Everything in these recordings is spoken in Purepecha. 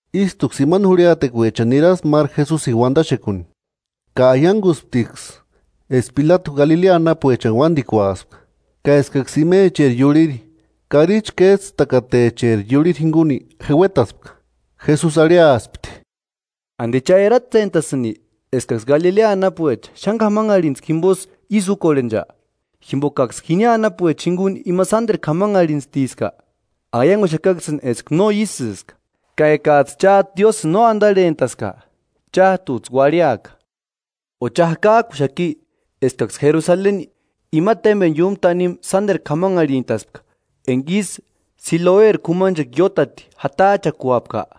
Ístuksï imani jurhiatekuechani niraspti máru Jesusini uandaxekuni, ka aiangusptiksï eska Pilatu Galilea anapuechani uándikuaspka, ka eskaksï imecheri iurhiri, karichi kéjtsïtakatecheri iurhiri jinguni jeuetaspka. Jesusi arhiaspti: “¿Andi cha eratsentasïnki eskaksï Galilea anapuecha xáni k'amanharhintskua jimbosï ísï úkorhencha; jimbokaksï jini anapuecha jinguni ima sánderu k'amanharhintstiska? Aianguxakaksïni eska no ísïska; ka ekajtsï chájtu Diósïni no andarhentaska, chájtujtsï uarhiaka. ¿O cha jakajkuxaki eskaksï Jerusaleni ima témbeni iúmu tanimu sánderu k'amanharhintaspka enga ísï Siloeri k'umanchekua iótati jatajchakuapka?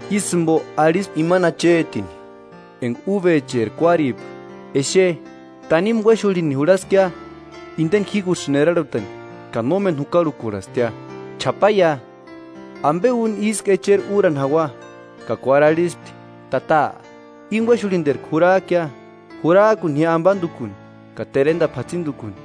Ísï jimbo arhispti imani achetini enga ubecheri kuáripka: ‘Exe, tanimu uéxurhini jurhaskia indeni jígusïni erarhutani, ka nómeni jukarhukurhastia. Ch'apaia; ¿Ambe úni ísku echeri úrani jaua?’ Ka kuári arhispti: ‘Tata, íni uéxurhinterku jurajkia; jurajkuni ji ambandukuni ka terendapu jatsindukuni.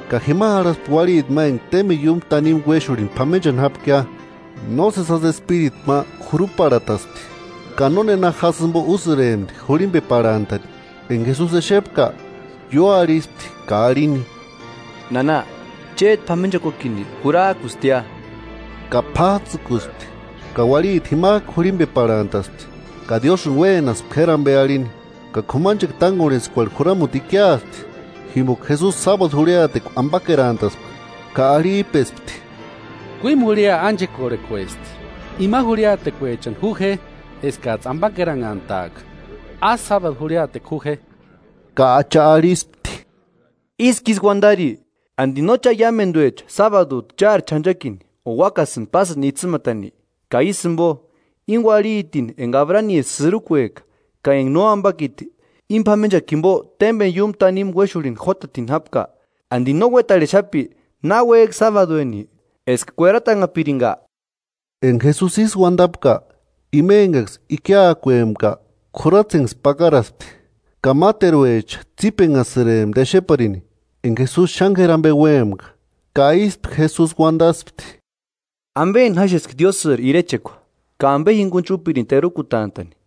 ka jima jarhaspti uarhiti ma enga témbeni iúmu tanimu uéxurhini p'amenchani jápkia. Nósesi jásï espiritu ma juruparhataspti, ka nónena jásï jimbo úsïrempti jurhimbeparhantani. Enga Jesusi exepka, ióarhispti ka arhini: –Nana, chéti p'amenchakuakini jurajkustia. Ka p'ájtsïkuspti, ka uarhiti jimajku jurhimbeparhantaspti, ka Diósïni uénaspti k'éri ambe arhini. Ka k'umanchekua tángorhentskuerhu juramuti ikiaspti, jimboka Jesusi sábadu jurhiatekua ambakerantaspka, ka arhijpespti: –Kuímu jurhia ánchekorhekuesti; imani jurhiatekuechani ju je eskajtsï ambakeranhantaaka, ásï sábadu jurhiatekua ju je. Ka Acha arhispti: –¡Ísku ísï uandari! ¿Andi no cha iámenduecha sábadujtu chári ch'anchakini o úakasïni pásïni itsïmatani? Ka ísï jimbo, íni uarhitini enga Abraniri sïrukueka ka enga nóambakiti íni p'amenchakua jimbo témbeni iúmu tanimu uéxurhini jótatini jápka, ¿Andi no uetarhexapi náuejki sábadueni eska kueratanhapiringa? Enga Jesusi ísï uandapka, ima engaksï ikiakuempka k'uratsenksï pakaraspti; ka máteruecha tsípenhasïrempti exeparini enga Jesusi xáni k'éri ambe úempka. Ka ístu Jesusi uandaspti: “¿Ambeni jáxeski Diósïri irechekua ka ambe jingunichi úpirini terukutantani?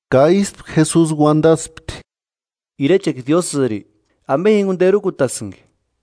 Ka ístu Jesusi uandaspti: “Irechekua Diósïrini ¿Ambe jinguni terukutasïnki?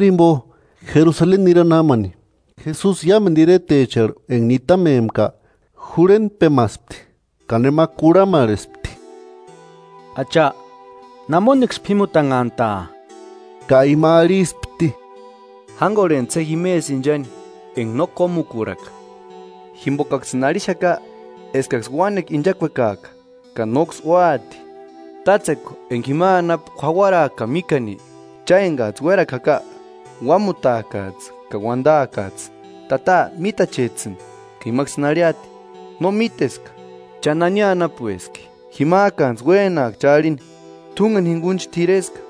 Xanhari jimbo Jerusaleni nirani jámani, Jesusi iámendu iretecharhu enga nitamempka jurhentpemaspti. Ka nema kurhamarhespti: –Acha, ¿Namoniksï p'ímutanhantaa? Ka ima arhispti: 24–Jángorhentsi je jimesï inchani enga no kómukurhaka, jimbokaksïni arhixaka eskaksï uánekua inchakuekaaka, ka nóksï úati. Tátsekua enga jima anapu jauaraaka ka míkani, cha engajtsï uérakua jaka, uámutaakajtsï ka uandaakajtsï: Tata, mítachejtsïni. Ka imaksïni arhiati: No míteska cha nani anapueski. Jimajkanijtsï uénaaka cha arhini: T'úngeni jingunichi t'ireska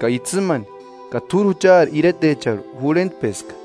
ka itsïmani ka t'úri juchari iretecharhu jurhentpeska.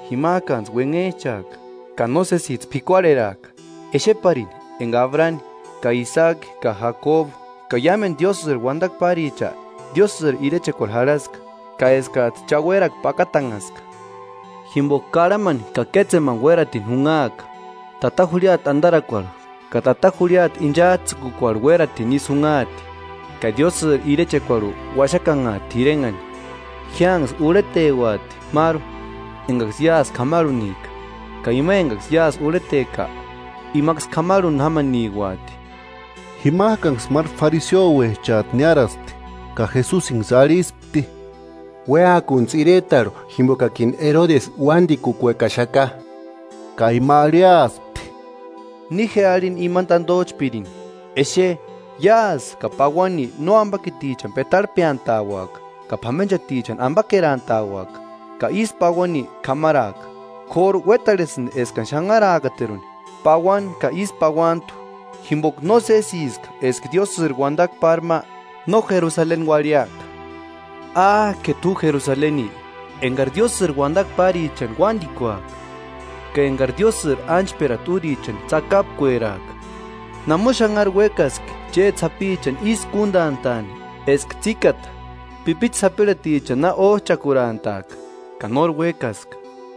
Jimajkantsï uenhejchaaka ka no sésijtsï p'ikuarheraaka exeparini enga Abrani ka Isaaki ka Jacobu ka iámendu Diósïri uandakua páricha Diósïri irechekuarhu jarhaska, ka eskajtsï cha uérakua pakatanhaska. Jimboka karhamani ka kétsemani ísï uératini junhaaka, tata jurhiata andarakuarhu ka tata jurhiata inchajtsïkukuarhu uératini isï junhaati, ka Diósïri irechekuarhu uaxakanhaati t'irenhani. Jiánksï urheteuati máru engaksï iásï k'amarhunika, ka ima engaksï iásï urheteka, imaksï k'amarhuni jámaniuaati. Jimajkanksï máru fariseouechajtu niáraspti, ka Jesusinksï arhispti: –Uéakuntsï iretarhu jimbokakini Erodesi uándikukuekaxaka. Ka ima arhiaspti: –Ni je arhini imani tandojchpirini: Exe, iásï ka pauani nóambakitichani petarhejpeantauaka ka p'amenchatichani ambakerantauaka, ka ísï pauani k'amaraaka. K'óru uétarhesïndi eskani xanharaakateruni, pauani ka ísï pauantu, jimboka nósesiska eska Diósïri uandakua pári ma no Jerusaleni uarhiaka. “¡Ákeru t'u Jerusaleni, engari Diósïri uandakua párichani uándikuajka, ka engari Diósïri ánchperata úrichani tsakapkueraajka! ¡Namoni xanhari uékaski chéti sapichani ísï kúndantaani eska tsíkata pipichu sapirhatichani na ójchakurantaajka, ka nóri uékaska!